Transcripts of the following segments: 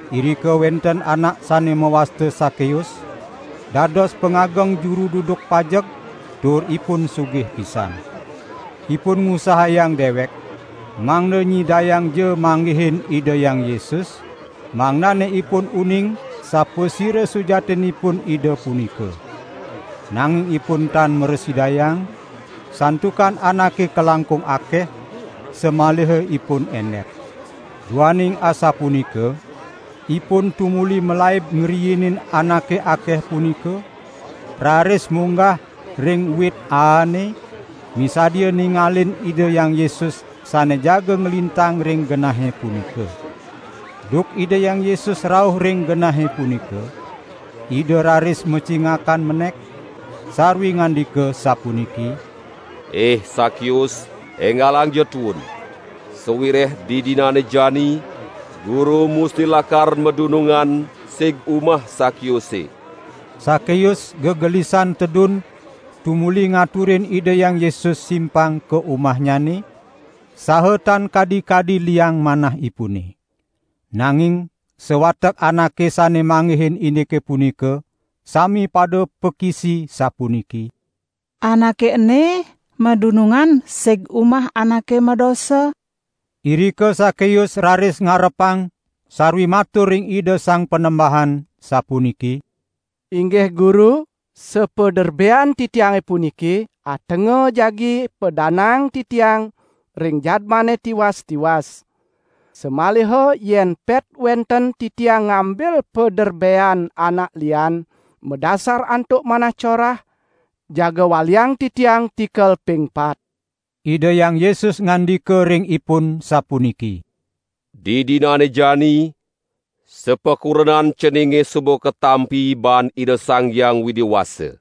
Irika wenten anak sane mawasta Sakeus, dados pangageng juru duduk pajeg, tur ipun sugih pisan. Ipun ngusahayang dewek, mangda nyidayangja manggihin Ida Hyang Yesus, mangdane ipun uning sapasira sujatinipun Ida punika. Nanging ipun tan mrasidayang, santukan anake kalangkung akeh, samaliha ipun endep. Duaning asapunika, ipun tumuli malaib ngriinin anake akeh punika, raris munggah ring wit aane, misadia ningalin Ida Hyang Yesus sane jaga nglintang ring genahe punika. Duk Ida Hyang Yesus rauh ring genahe punika, Ida raris macingakan menek, sarwi ngandika sapuniki: "Ih Sakeus enggalangja tuun! Sawireh didinane jani Guru musti lakar madunungan sig umah Sakeuse." Sakeus gegelisan tedun tumuli ngaturin Ida Hyang Yesus simpang ka umahnyane, saha tan kadi-kadi liang manahipune. Nanging sawatek anake sane manggihin indike punika sami pada pakisi sapuniki: "Anake ene madunungan sig umah anake madosa." Irika Sakeus raris ngarepang sarwi matur ring Ida Sang Panembahan, sapuniki: "Inggih Guru, sapaderbean titiange puniki atenga jagi padanaang titiang ring jadmane tiwas-tiwas. Samaliha yen pet wenten titiang ngambil paderbean anak lian madasar antuk manah corah, jaga waliang titiang tikel ping pat." Ida Hyang Yesus ngandika ring ipun sapuniki: "Didinane jani sapakurenan ceninge suba katampi baan Ida Sang Hyang Widi Wasa.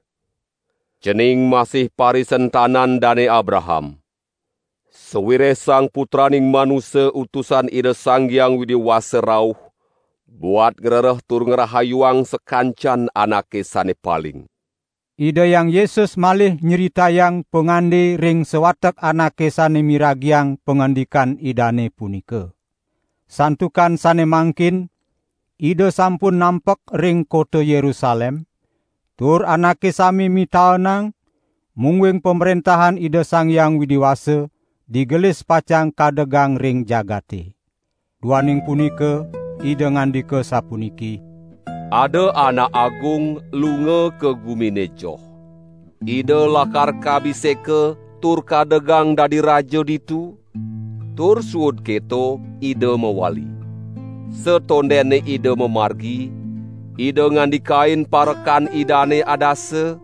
Cening masih parisentanan Dane Abraham. Sawireh Sang Putraning Manusa Utusan Ida Sang Hyang Widi Wasa rauh buat ngrereh tur ngrahayuang sakancan anake ane paling." Ida Hyang Yesus malih nyritayang pangande ring sawatek anake sane miragiang pangandikan Idane punika. Santukan sane mangkin Ida sampun nampek ring kota Yerusalem, tur anake sami mitaenang mungguing Pamrentahan Ida Sang Hyang Widi Wasa digelis pacang kadegang ring jagate. Duaning punika Ida ngandika sapuniki: "Ada anak agung lunga ka gumine joh. Ida lakar kabiseka tur kadegang dadi raja ditu, tur suud keto ida mawali. Satondene ida mamargi, ida ngandikain parekan idane adasa,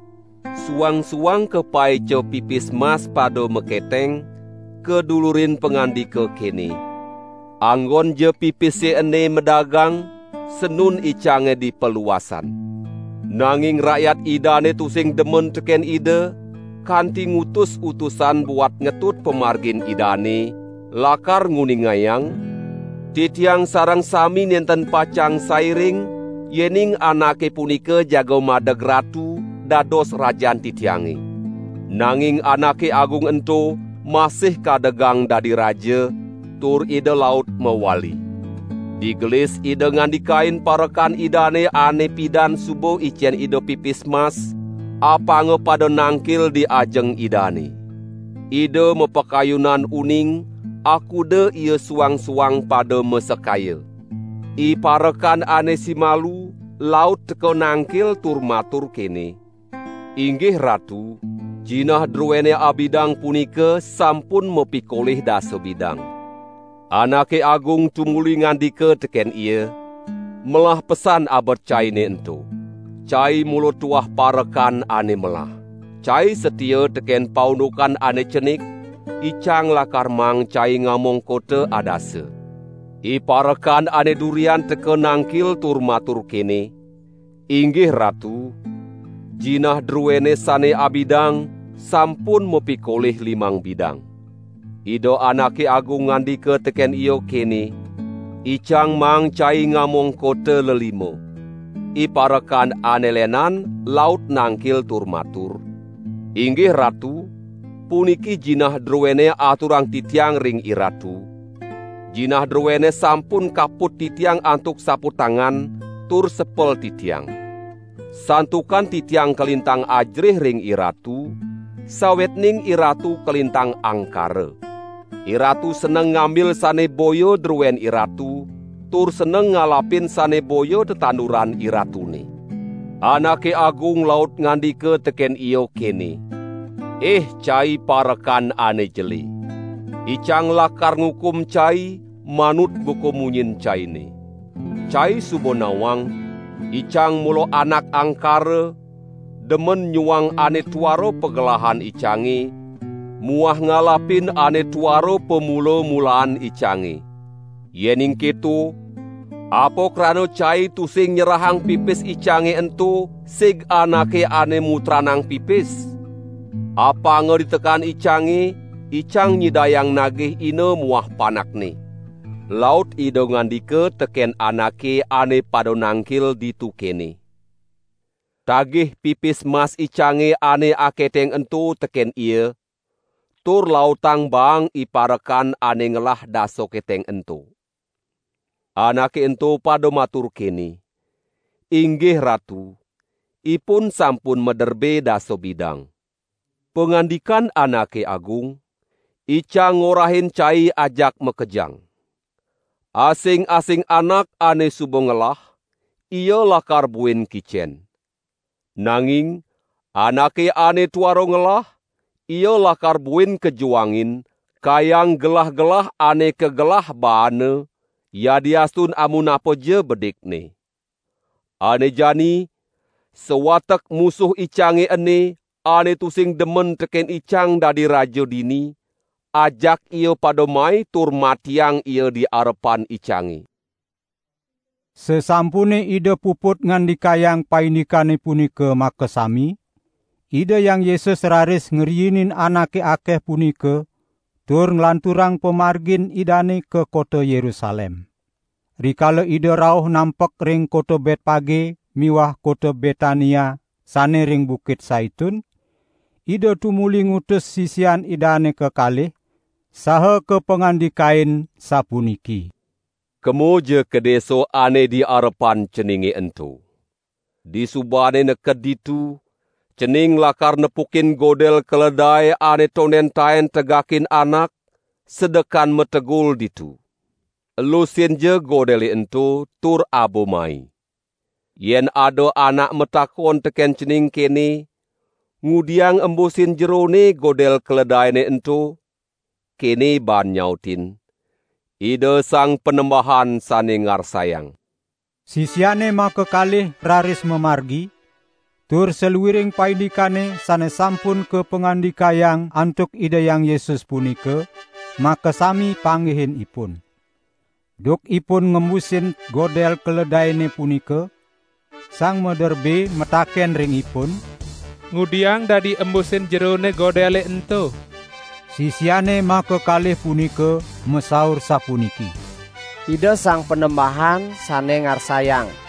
suang-suang kapaica pipis mas pada maketeng, kadulurin pangandika kene: 'Anggonja pipise ene madagang, sanun icange di paluasan.' Nanging rakyat idane tusing demen teken ida, kanti ngutus utusan buat ngetut pamargin idane, lakar nguningayang: 'Titiang sareng sami nenten pacang sairing, yening anake punika jaga madeg ratu, dados rajan titiange.' Nanging anake agung ento masih kadegang dadi raja, tur ida laut mawali. Digelis ida ngandikain parekan idane ane pidan suba icen ida pipis mas, apanga pada nangkil di ajeng idane. Ida mapakayunan uning, akuda ia suang-suang pada masekaya. Iparekan ane simalu laut teka nangkil tur matur kene: 'Inggih ratu, jinah druene abidang punika sampun mapikolih dasa bidang.' Anake agung tumuli ngandika teken ia: 'Melah pesan abet caine ento. Cai mula tuah parekan ane melah. Cai satia teken paundukan ane cenik, icang lakar maang cai ngamong kota adasa.' Iparekan ane durian teka nangkil tur matur kene: 'Inggih ratu, jinah druene sane abidang sampun mapikolih limang bidang.' Ida anake agung ngandika teken ia kene: 'Icang maang cai ngamong kota lelima.' Iparekan ane lenan laut nangkil tur matur: 'Inggih ratu, puniki jinah druene aturang titiang ring iratu; jinah druene sampun kaput titiang antuk saputangan tur sepel titiang. Santukan titiang kalintang ajerih ring iratu, sawetning iratu kalintang angkara. Iratu seneng ngambil sane boya druen iratu, tur seneng ngalapin sane boya tetanduran iratune.' Anake agung laut ngandika teken ia kene: 'Ih cai parekan ane jele. Icang lakar ngukum cai manut buka munyin caine. Cai suba nawang icang mula anak angkara, demen nyuang ane tuara pagelahan icange muah ngalapin ane tuara pamula-mulaan icange. Yening keto, apa krana cai tusing nyerahang pipis icange ento sig anake ane mutranang pipis? Apanga ditekan icange, icang nyidayang nagih ina muah panakne.' Laut ida ngandika teken anake ane pada nangkil ditu kene: 'Tagih pipis mas icange ane aketeng ento teken ia, tur lautang baang iparekan ane ngelah dasa keteng ento.' Anake ento pada matur kene: 'Inggih ratu, ipun sampun maderbe dasa bidang.' Pangandikan anake agung: 'Icang ngorahin cai ajak makejang. Asing-asing anak ane suba ngelah, ia lakar buin kicen. Nanging anake ane tuara ngelah, ia lakar buin kajuangin, kayang gelah-gelah ane kagelah baana, yadiastun amunapaja bedikne. Ane jani, sawatek musuh icange ene, ane tusing demen teken icang dadi raja dini, ajak ia pada mai tur matiang ia di arepan icange.'" Sasampune Ida puput ngandikayang paindikane punika makasami, Ida Hyang Yesus raris ngriinin anake akeh punika tur nglanturang pamargin Idane ka kota Yerusalem. Rikala Ida rauh nampek ring kota Betpage miwah kota Betania, sane ring Bukit Saitun, Ida tumuli ngutus sisian Idane kekalih, saha kapangandikain sapuniki: "Kemaja ka desa ane di arepan ceninge ento. Disubane neked ditu, cening lakar nepukin godel keledae ane tonden taen tegakin anak, sedekan mategul ditu. Elusinja godele ento tur aba mai. Yen ada anak matakon teken cening kene: 'Ngudiang embusin jerone godel keledaene ento,' kene baan nyautin: 'Ida Sang Panembahan sane ngarsayang.'" Sisiane makakalih raris mamargi, tur saluiring paindikane sane sampun kapangandikayang antuk Ida Hyang Yesus punika, makasami panggihin ipun. Duk ipun ngembusin godel keledaene punika, sang maderbe mataken ring ipun: "Ngudiang dadi embusin jerone godele ento?" Sisiane makakalih punika masaur sapuniki: "Ida Sang Panembahan sane ngarsayang."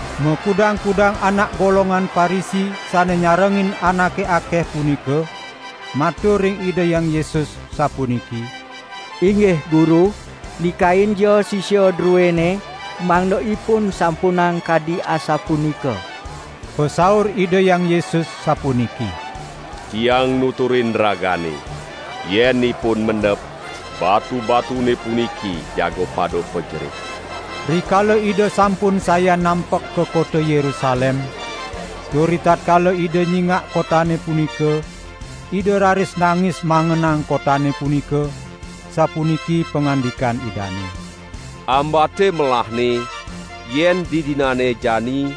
Makudang-kudang anak golongan Parisi sane nyarengin anake akeh punika, matur ring Ida Hyang Yesus, sapuniki: "Inggih Guru, nikainja sisia druene mangda ipun sampunang kadi asapunika!" Pasaur Ida Hyang Yesus sapuniki: "Tiang nuturin ragane, yen ipun mendep, batu-batune puniki jaga pada pajerit." Rikala Ida sampun sayan nampek ka kota Yerusalem, tur ritatkala Ida nyingak kotane punika, Ida raris nangis mangenang kotane punika, sapuniki pangandikan Idane: "Ambate melahne yen didinane jani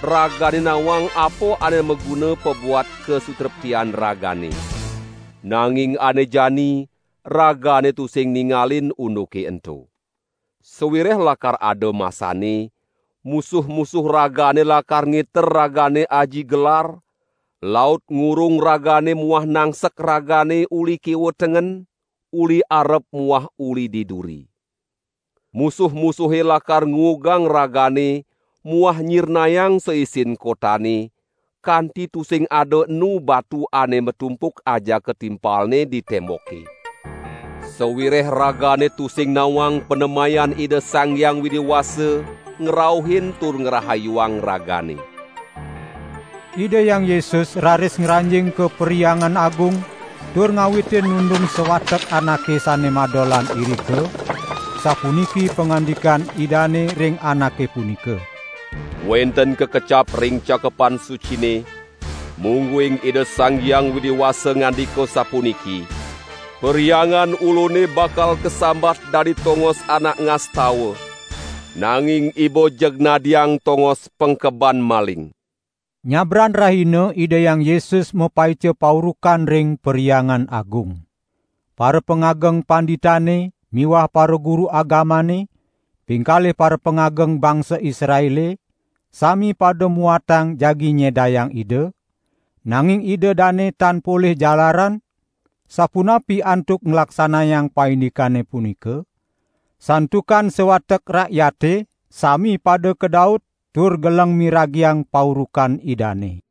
ragane nawang apa ane maguna pabuat kasutreptian ragane. Nanging ane jani ragane tusing ningalin unduke ento. Sawireh lakar ada masanne, musuh-musuh ragane lakar ngiter ragane aji gelar, laut ngurung ragane muah nangsek ragane uli kiwa tengen, uli arep muah uli di duri. Musuh-musuhe lakar nguugang ragane muah nyirnayang saisin kotane, kanti tusing ada enu batu ane matumpuk ajaka timpalne di temboke. Sawireh ragane tusing nawang panemayan Ida Sang Hyang Widi Wasa ngrauhin tur ngrahayuang ragane." Ida Hyang Yesus raris ngranjing ka Perhyangan Agung tur ngawitin nundung sawatek anake sane madolan irika, sapuniki pangandikan Idane ring anake punika: "Wenten kakecap ring Cakepan Sucine, mungguing Ida Sang Hyang Widi Wasa ngandika sapuniki: 'Perhyangan Ulune bakal kasambat dadi tongos anak ngastawa. Nanging iba jeg nadiang tongos pengkeban maling.'" Nyabran rahina Ida Hyang Yesus mapaica paurukan ring Perhyangan Agung. Parapangageng panditane miwah paraguru agamane, pingkalih parapangageng bangsa Israele, sami pada muatang jagi nyedayang Ida, nanging ida dane tan polih jalaran, sapunapi antuk nglaksanayang paindikane punika, santukan sawatek rakyate sami pada kadaut tur geleng miragiang paurukan Idane.